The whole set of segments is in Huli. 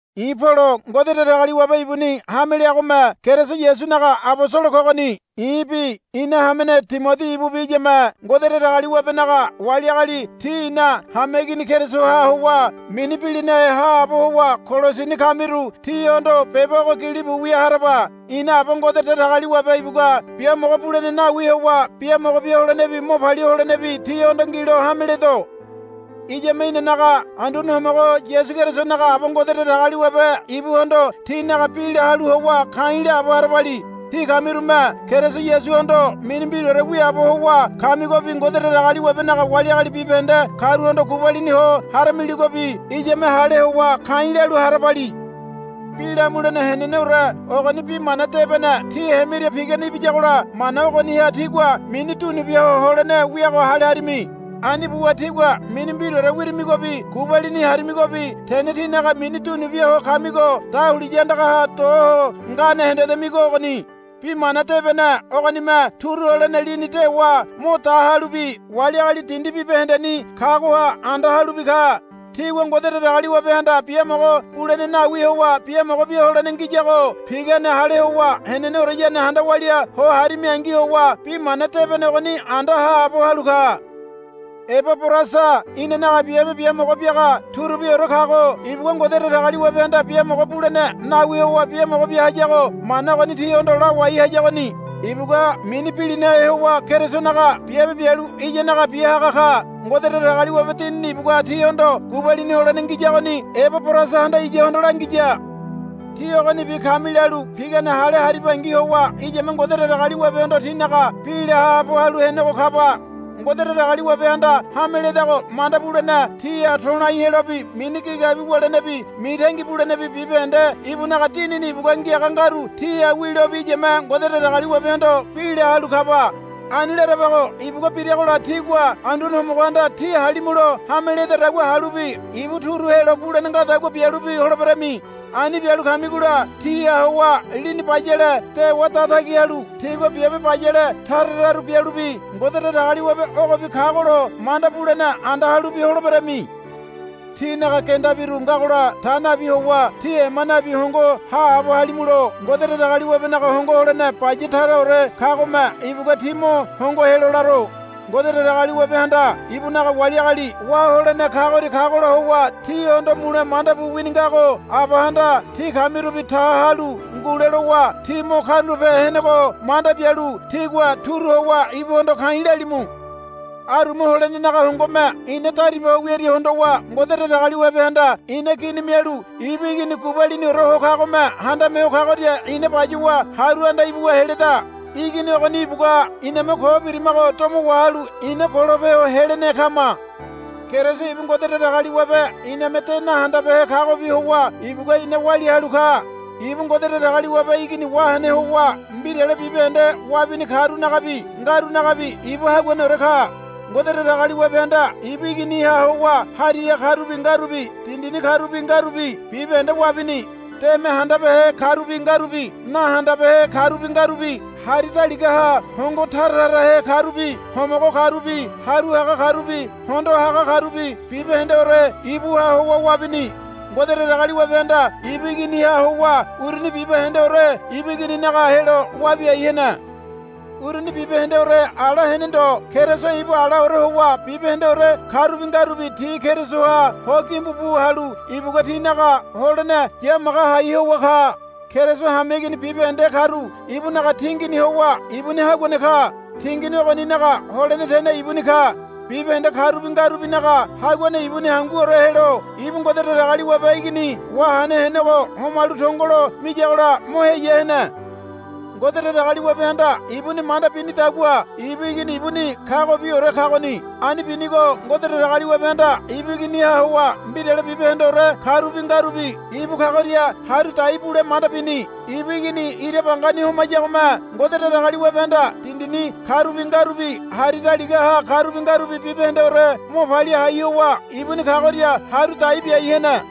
I̱ Polo Ngode Datagaliwabe ibuni hame leagome Keriso Yasunaga abosolo kogoni. I̱bi ina hamene Timodi ibubi iyame Ngode Datagaliwabenaga wali agali tí ina hameigini Kerisoha howa mini bilinahe haabo howa Kolosini kamiru tíhondo beba ogo gilibu wia haraba. Ina Aba Ngode Datagaliwabe ibugua biamogo bulene nawi howa biamogo bia holenebi mo palia holenebi tíhondo ngilo hame ledo. Iyame inanaga Anduane Homogo Yasu Kerisonaga Aba Ngode Datagaliwabe ibuhondo tínaga bi la halu howa ka̱i̱ laabo harabali. Tí kamirume Keriso Yasuhondo mini mbiraore wiaabo howa kamigobi Ngode Datagaliwabenaga wali agali bibahende karuhondo gubalini ho haramiligobi iyame hale howa ka̱i̱ lalu harabali. Bi lamulene heneneore ogoni Bi Mana Debene tí hemiria pigane ibiyagola mana ogoniha tígua mini dunu bia ho holene wiago hale harimi. Ani buwa tígua mini mbiraore wirimigobi gubalini harimigobi tene tínaga mini dunu bia ho kamigo dahuliya andagaha do ho ngane hendedamigo ogoni. Bi mana debene ogonime turu holene lini dewa mo da halubi wali agali dindi bibahendeni kagoha anda halubi ka. Tígua Ngode Datagaliwabehanda biamogo bulene nawi howa biamogo bia holene ngiyago pigane hale howa heneneoreyane handa walia ho harimingi howa bi mana debene ogoni anda haabo halu ka. Ebaborasa inanaga biabe biamogo biaga turubiore kago ibugua Ngode Datagaliwabehanda biamogo bulene nawi howa biamogo bia hayago mana ogoni tíhondo lawai hayagoni. Ibugua mini bilinahe howa Kerisonaga biabe bialu iyanaga bia haga ka. Ngode Datagaliwabe Dinini ibugua tíhondo gubalini holene ngiyagoni Ebaborasahanda iyahondo langiya. Tí ogonibi kami lalu pigane hale haribangi howa iyame Ngode Datagaliwabehondo tínaga bi la haabo halu henego kaba. Ngode Datagaliwabehanda hame ledago manda bulene tíha to̱lai helobi mini gigabi wulenebi mitangi bulenebi bibahende ibunaga Dinini ibugua ngiaga ngaru tíha wilobi iyame Ngode Datagaliwabehondo bi la halu kaba. Ani larabago ibugua biragola tígua Anduane Homogohanda tí halimulo hame ledadagua halubi ibu turu helo bulene ngadagua bialubi holeberami. Ani bialu kamigola tíha howa lini bayale dewa datagi halu tígua biabe bayale tara tararu bialubi Ngode Datagaliwabe ogobi kagolo manda bulene anda halubi holeberami. Tínaga gendabiru ngagola ta nabi howa tí ema nabi hongo haabo halimulo Ngode Datagaliwabenaga hongo holene baya taraore kagome ibugua tí mo hongo helo laro. Ngode Datagaliwabehanda ibunaga wali agali wá holene kagoria kagola howa tihondo mule manda bu wini ngago Abahanda tí kamirubi ta halu ngule lowa tí mo karulape henego manda bialu tígua turu howa ibuhondo ka̱i̱ lalimu. Aruma holenenaga hongome ina dariba ho wiaria hondowa Ngode Datagaliwabehanda ina gini mialu ibu Igini gubaliniore ho kagome handame ho kagoria ina bayuwa haru anda ibuwa heleda. Igini ogoni ibugua iname ko birimago domo wahalu ina golope ho helene kama. Keriso ibu Ngode Datagaliwabe iname de nahandabehe kagobi howa ibugua ina walia halu ka. Ibu Ngode Datagaliwabe Igini wahene howa mbirale bibahende wabini karunagabi ngarunagabi ibu haguaneore ka. Ngode Datagaliwabehanda ibu Iginiha howa hariha karubi ngarubi dindini karubi ngarubi bibahende wabini. Deme handabehe karubi ngarubi nahandabehe karubi ngarubi hari daligaha hongo tara tarahe karubi homogo karubi haru haga karubi hondo haga karubi bibahendeore ibuha howa wabini. Ngode Datagaliwabehanda ibu Iginiha howa uruni bibahendeore ibu Igininaga helo wabiai hene. Uruni bibahendeore ala hene ndo Keriso ibu alaore howa bibahendeore karubi ngarubi ti Kerisoha ho gimbu bu halu ibugua tinaga holene yamaga hai howa ka. Keriso hameigini bibahende karu ibunaga tingini howa ibuni haguane ka. Tingini ogoninaga holene tene ibuni ka. Bibahende karubi ngarubinaga haguane ibuni hanguore helo ibu Ngode Datagaliwabe Igini wahene henego homalu tongolo miyagola mo heya hene. Ngode Datagaliwabehanda ibuni manda binidagua ibu Igini ibuni kagobiore kagoni. Ani binigo Ngode Datagaliwabehanda ibu Iginiha howa mbirale bibahendeore karubi ngarubi ibu kagoria haru dai bule manda bini. Ibu Igini ira bangani homayagome Ngode Datagaliwabehanda dindini karubi ngarubi hari daligaha karubi ngarubi bibahendeore mo palia hai howa ibuni kagoria haru dai biai hene.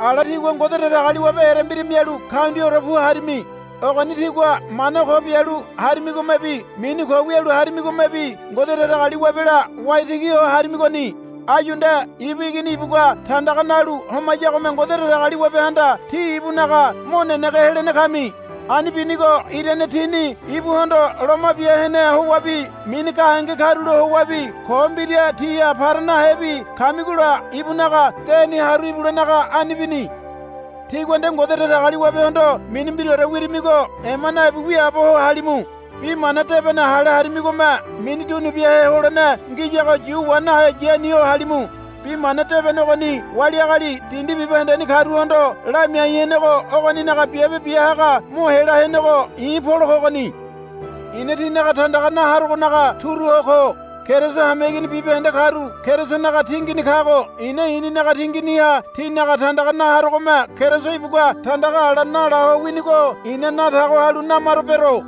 Ala tígua Ngode Datagaliwabe erembira mialu kaundiaore pu harimi. Ogoni tígua mana ko bialu harimigomebi mini ko wialu harimigomebi Ngode Datagaliwabela waitigi ho harimigoni. Áyu nde ibu Igini ibugua tandaga nalu homayagome Ngode Datagaliwabehanda tí ibunaga mo nenege helene kami. Ani binigo irane tíni ibuhondo loma bia hene howabi mini gahenge karulo howabi ko mbira tíha para nahebi kamigola ibunaga deni haru ibulenaga ani bini. Tígua nde Ngode Datagaliwabehondo mini mbiraore wirimigo ema nabi wiaabo ho halimu. Bi mana debene hale harimigome mini dunubiahe holene ngiyago yu wa nahe yani ho halimu. Bi mana debene ogoni wali agali dindi bibahendeni karuhondo lamiai henego ogoninaga biabe bia haga mo hela henego i̱ Polo kogoni. I̱na tínaga tandaga na harogonaga turu ho ko. Keriso hameigini bibahende karu Kerisonaga tingini kago i̱na i̱ninaga tinginiha tínaga tandaga na harogome Keriso ibugua tandaga ala nala ho winigo i̱na na tago halu namaro bero.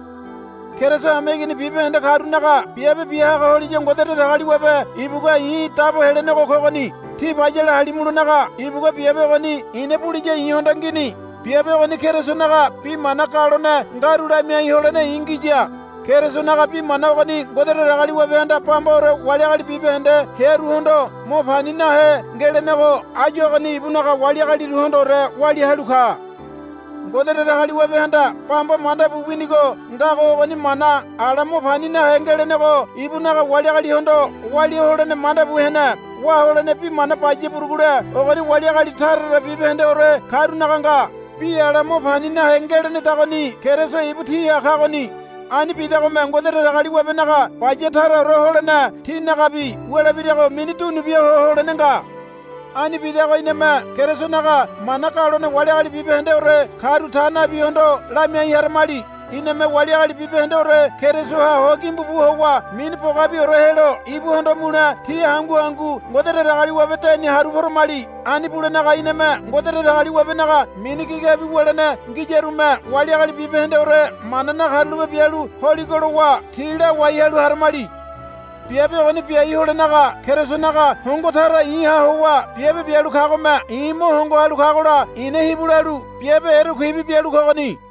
Keriso hameigini bibahende karunaga biabe bia haga holiya Ngode Datagaliwabe ibugua i̱ dabo helenego kogoni. Tí bayale halimulonaga ibugua biabe ogoni i̱na buliya i̱hondo ngini. Biabe ogoni Kerisonaga bi mana galone ngaru lamiai holene i̱ ngiya. Kerisonaga bi mana ogoni Ngode Datagaliwabehanda bambaore wali agali bibahende hearuhondo mo pani nahe ngelenego áyu ogoni ibunaga wali agaliruhondoore walia halu ka. Ngode Datagaliwabehanda bamba manda bu winigo ngago ogoni mana ala mo pani nahe ngelenego ibunaga wali agalihondo walia holene manda bu hene. Wá holene bi mana baya burugule ogoni wali agali taratara bibahendeore karunaga nga. Bi ala mo pani nahe ngelenedagoni Keriso ibu tíha kagoni. Ani bidagome Ngode Datagaliwabenaga baya taraore holene tínagabi wulebirago mini dunubia ho holene nga. Ani bidago iname Kerisonaga mana galone wali agali bibahendeore karu ta nabihondo lamiai haramali. Iname wali agali bibahendeore Kerisoha ho gimbu bu howa mini bogabiore helo ibuhondo mule ti hangu hangu Ngode Datagaliwabe deni haru poramali. Ani bulenaga iname Ngode Datagaliwabenaga mini gigabi wulene ngiyarume wali agali bibahendeore mana nakarulape bialu holigo lowa ti lawai halu haramali. Biabe ogoni biai holenaga Kerisonaga hongo tara i̱ha howa biabe bialu kagome i̱ mo hongo halu kagola i̱na hibu lalu biabe erekuibi bialu kogoni.